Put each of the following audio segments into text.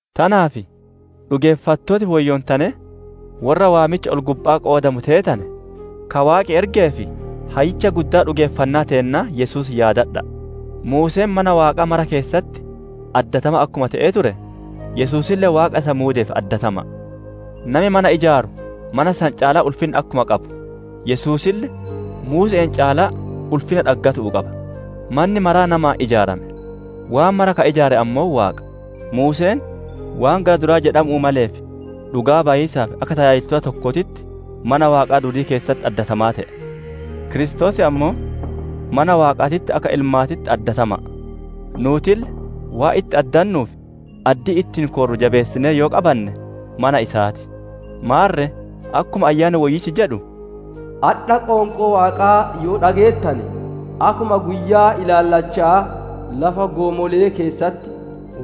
Tanaaf dhugeeffattooti woyyoontanee, worra waamicha ol-gubba'aa qoodamu teetane, ka Waaqi ergee fi Hayyicha Guddaa dhugeeffannaa teennaa Yesuus yaadadha'a. Muuseen mana Waaqaa mara keessatti addatamaa akkuma te'ee ture, Yesuusille Waaqa isa muudeef addatama'a. Nami mana ijaaru mana san caalaa ulfinna akkuma qabu, Yesuusille, Muuse'een caalaa ulfinna dhaggatuu qaba. Manni maraa namaan ijaarame; waan mara ka ijaare ammoo Waaqa. Muuseen waan gara duraa jedhamu'uu maleef dhugaa bayiisaaf, akka tajaajilaa tokkootitti mana Waaqaa duudii keessatti addatamaa te'e. Kiristoos ammoo mana Waaqaatitti akka ilmaatitti addatama'a. Nuutille waan itti addannuu fi addii ittiin koorru jabeessinee yoo qabanne mana isaa ti. Maarre akkuma Ayyaanni Woyyichi jedhu, «Adha, qoonqoo Waaqaa yoo dhageettane, akkuma guyyaa ilaallacha'aa lafa goomolee keessatti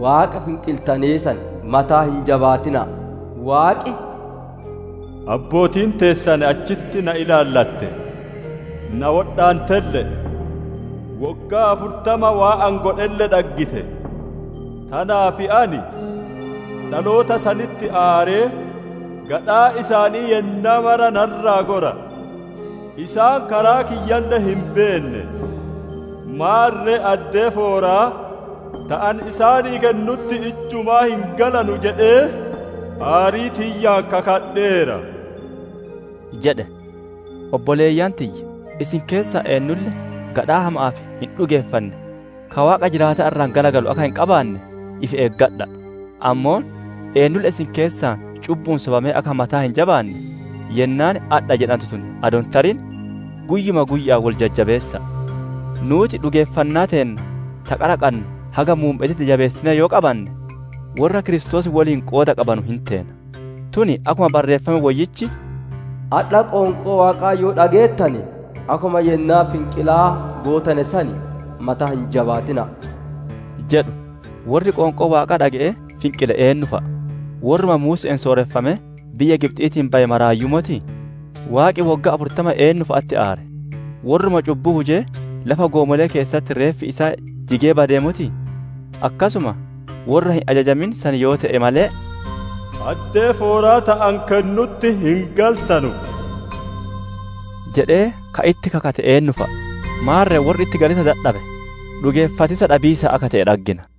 Waaqa finqiltanee san mataa hin jabaatina'a! Waaqi, ‹Abbootiin teessan achitti na ilaallatte; na wodhaantelle'e; woggaa afurtama waan ani godhelle dhaggite. Tanaaf ani dhaloota sanitti aaree, gadhaan isaanii yennaa mara na irraa gora, isaan karaa kiyyalle hin beenne. Maarre addee fooraa ta ani isaanii kennutti ijjumaa hin galanu jedhee aarii tiyyaan kakadheera› jedhe». Obboleeyyan tiyya, isin keessaa eennulle gadhaa hama'aa fi hin dhugeeffanne, ka Waaqa jiraataa irraa garagalu akka hin qabaanne ifi eeggadha'a! Ammoo eennulle isin keessaa cubbu'uun sobamee akka mataa hin jabaanne, yennaan «Adha» jedhantu tun adoo hin tarin guyyuma guyya'aan wol jajjabeessa'a! Nuuti dhugeeffannaa teenna ta qara qannu haga muumme'eetitti jabeessinee yoo qabanne, worra Kiristoos woliin qooda qabaannu hin teena. Tun akkuma Barreeffami Woyyichi, «Adha qoonqoo Waaqaa yoo dhageettane, akkuma yennaa finqilaa gootane san mataa hin jabaatina'a!» jedhu. Worri qoonqoo Waaqaa dhage'ee finqile eennu fa'a? Worruma Muuse'een sooreffamee biyya Gibxiitii baye maraayyuu motii? Waaqi woggaa afurtama eennufa'atti aare? Worruma cubbuu hujee, lafa goomole'ee keessatti reeffi isaa jigee badee motii? Akkasuma worra hin ajajamin san yoo te'e malee, «Addee fooraa ta ani kennutti hin galtanu» jedhee ka itti kakate eennu fa'a? Maarre worri itti galiisa dadhabe, dhugeeffatiisa dhabiisaan akka te'e dhaggina.